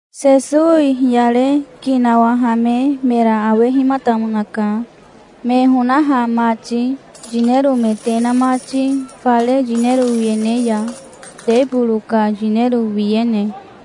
Sesowi hiyare ki nawahame mera awehimatamonaka, me honaha mati, yinero me te na mati fare yinero wiyene ya, teboro ka yinero wiyene.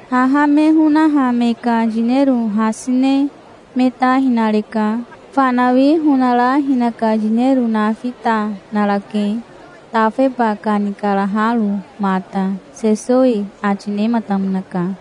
Haha me honaha me ka yinero hasi ne me ta hinareka. Fanawi honara hinaka yinero nafi ta narake, tafeba kanikaraharo mata", Sesowi ati nematamonaka.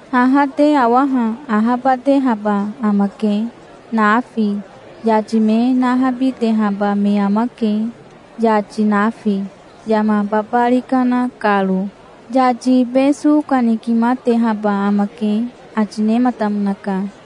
"Haha te awaha ahabatehaba amake, nafi. Yati me nahabitehaba me amake, yati nafi, yama babari kana karo. Yati ibe so kanikimatehaba amake", ati nematamonaka.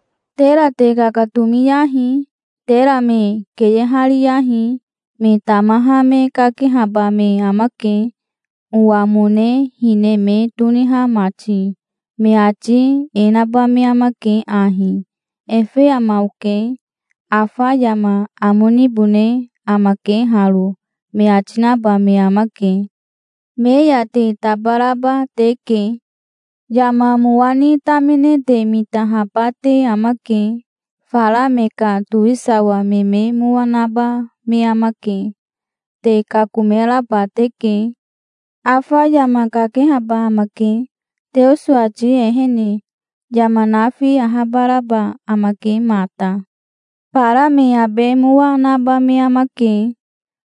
"Tera te kakatomiyahi. Tera me keyehariyahi. Me tamaha me kakehaba me amake, owamone hine me toniha mati. Me ati e naba me amake ahi: 'Efe ama oke. Afa yama amo nibone amake haro', me ati naba me amake. Me ya te tabaraba teke". "Yama mowa ni tamine te mitahaba te amake. Fara me ka towisawa me me mowa naba me amake. Te kakomeraba teke. Afa yama kakehaba amake, Teoso ati ehene. Yama nafi ahabaraba amake mata. Bara me abe mowa naba me amake.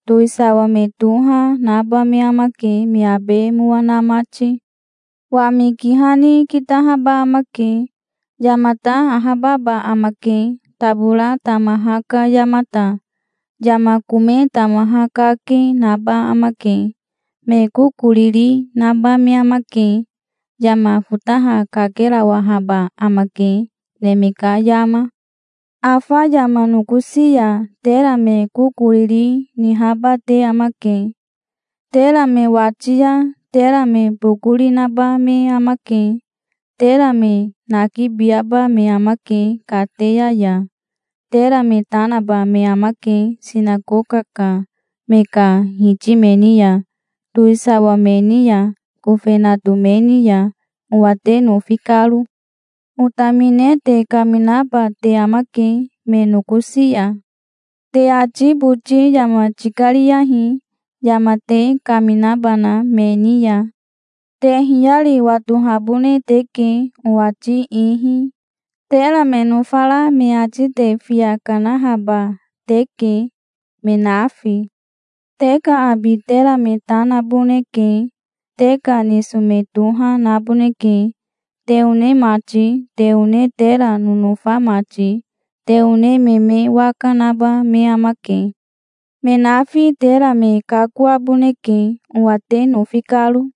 Towisawa me toha naba me amake, me abe mowa na mati. Wami kiha ni kitahaba amake. Yamata ahababa amake, tabora tamaha ka yamata. Yama kome tamaha kake, naba amake. Me korikoriri naba me amake. Yama fotaha kakerawahaba amake, neme ka yama". "Afa yama nokosi ya tera me kokoriri nihaba te amake. Tera me wati ya tera me bokori naba me amake. Tera me nakibiaba me amake kateya ya. Tera me ta naba me amake sinakoka ka me ka hiti me ni ya, towisawa me ni ya, kofenato me ni ya, owa te nofi karo. Otamine te kaminaba te amake me nokosi ya. Te ati boti yama tikariyahi, yama te kaminabana me ni ya. Te hiyari watohabone teke, owati ihi. Tera me nofara me ati te fiya kanahaba teke, me nafi. Te ka abi tera me ta naboneke. Te ka niso me toha naboneke, te one mati, te one tera nonofa mati. Te one me me waka naba me amake. Me nafi tera me kakoaboneke, owa te nofi karo.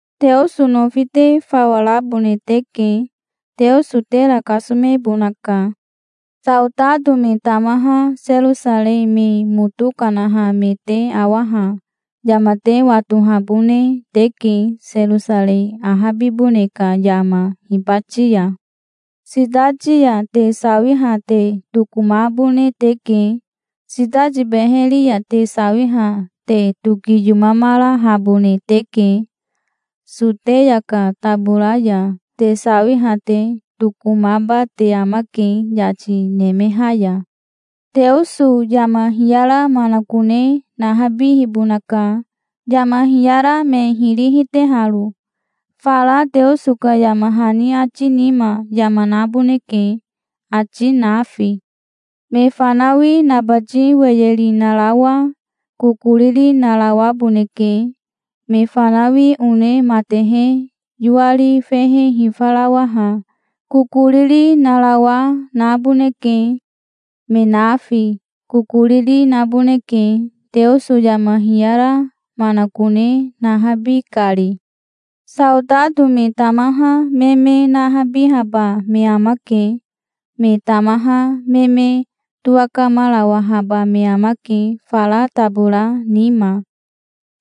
Teoso nofi te fawa rabone teke. Teoso tera kasomebonaka". "Saotato me tamaha Serosarei me moto kanaha me te awaha yama te watohabone teke, Serosarei ahabibone ka yama, hibati ya. Sitati ya te sawiha te tokomabone teke. Sitati beheri ya te sawiha te tokiyomamarahabone teke. Soteya ka tabora ya te sawiha te tokomaba te amake yati nemeha ya. Teoso yama hiyara manakone nahabihibonaka, yama hiyara me hiri hiteharo. Fara Teoso ka yama hani ati nima, yama naboneke, ati nafi. Me fanawi nabati weyeri narawa kokoriri narawaboneke. Me fanawi one matehe yoari fehe hifarawaha kokoriri narawa naboneke. Me nafi kokoriri naboneke, Teoso yama hiyara manakone nahabi kari. Saotato me tamaha me me nahabihaba me amake. Me tamaha me me towakamarawahaba me amake fara tabora nima.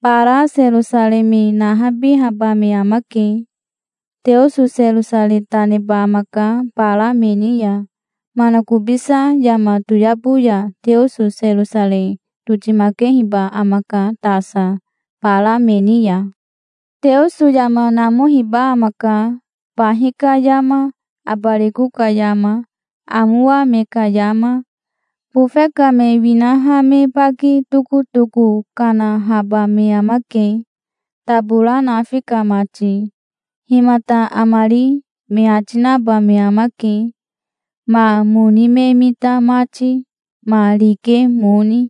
Bara Serosarei me nahabihaba me amake. Teoso Serosarei ta neba amaka bara me ni ya. Manakobisa yama toyabo ya Teoso Serosarei totimaketehiba amaka tasa, bara me ni ya". "Teoso yama namohiba amaka, bahi ka yama, abariko ka yama, amowa me ka yama. Bofe ka me winaha me baki tokotoko kanahaba me amake, tabora nafi ka mati. 'Himata amari?' me ati naba me amake, ma moni me mita mati, ma rike moni.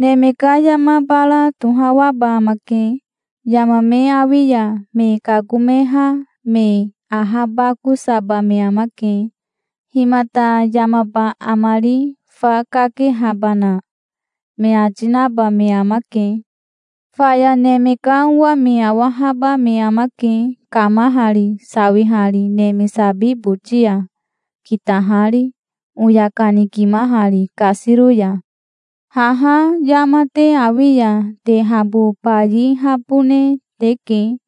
Neme ka yama bara tohawaba amake. Yama me awi ya me kakomeha me ahabakosaba me amake. 'Himata yamaba amari fa, kakehabana?' me ati naba me amake". "Faya Neme ka Owa me awahaba me amake, kamahari, sawihari neme sabi boti ya, kitahari, oya kanikimahari kasiro ya. Haha yama te awi ya te habo bayihabone teke.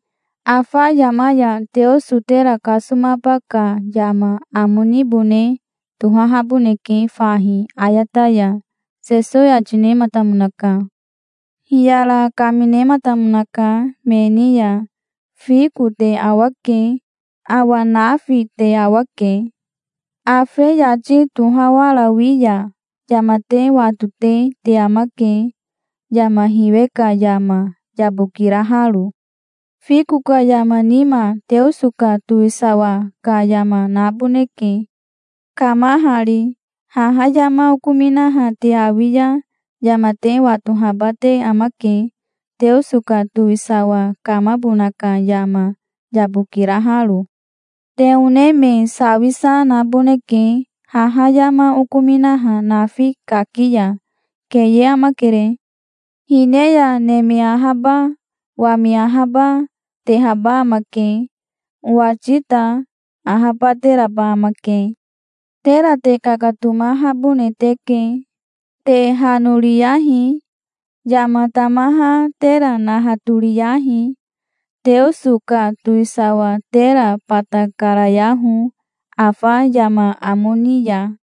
Afa yama ya Teoso tera kasomaba ka yama amo nibone tohahaboneke fahi ayata ya", Sesowi ati nematamonaka. Hiyara kaminematamonaka me ni ya. "Fiko te awake. Awa nafi te awa, ke. Afe yati tohawarawi ya yama te watote te amake, yama hiwe ka yama, yabokiraharo. Fiko ka yama nima Teoso ka towisawa ka yama naboneke, kamahari. Haha yama okominaha te awi ya yama te watohaba te amake, Teoso ka towisawa kamabona ka yama, yabokiraharo. Te one me sawisa naboneke haha yama okominaha nafi kaki ya. Keye amakere. Hine ya neme ahaba, wami ahaba, tehaba amake. Owati ta ahabateraba amake". "Tera te kakatomahabone teke. Te hanoriyahi. Yama tamaha tera nahatoriyahi. Teoso ka towisawa tera bata karayaho, afa yama amo ni ya.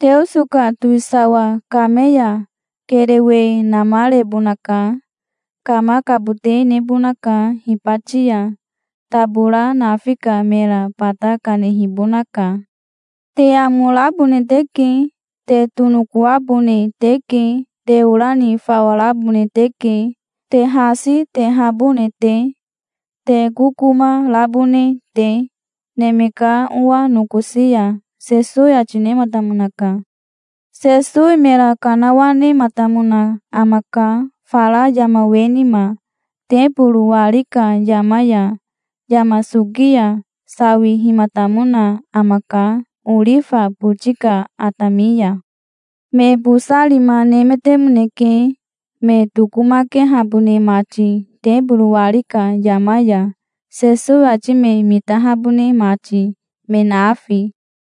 Teoso ka towisawa kame ya kerewe namarebonaka. Kamakabote nebonaka hibati ya. Tabora nafi ka mera bata kanehibonaka. Te amo rabone teke. Te tonokoabone teke. Te ora ni fawa rabone teke, te hasi tehabone te, te kokoma rabone te, Neme ka Owa nokosi ya", Sesowi ati nematamonaka. Sesowi mera kanawanematamona amaka fara yama we nima, teboro wari ka yama ya. Yama soki ya sawihimatamona amaka orifa boti ka atami ya. Me bosa rima nemetemoneke, me tokomakehabone mati teboro wari ka yama ya, Sesowi ati me mitahabone mati, me nafi.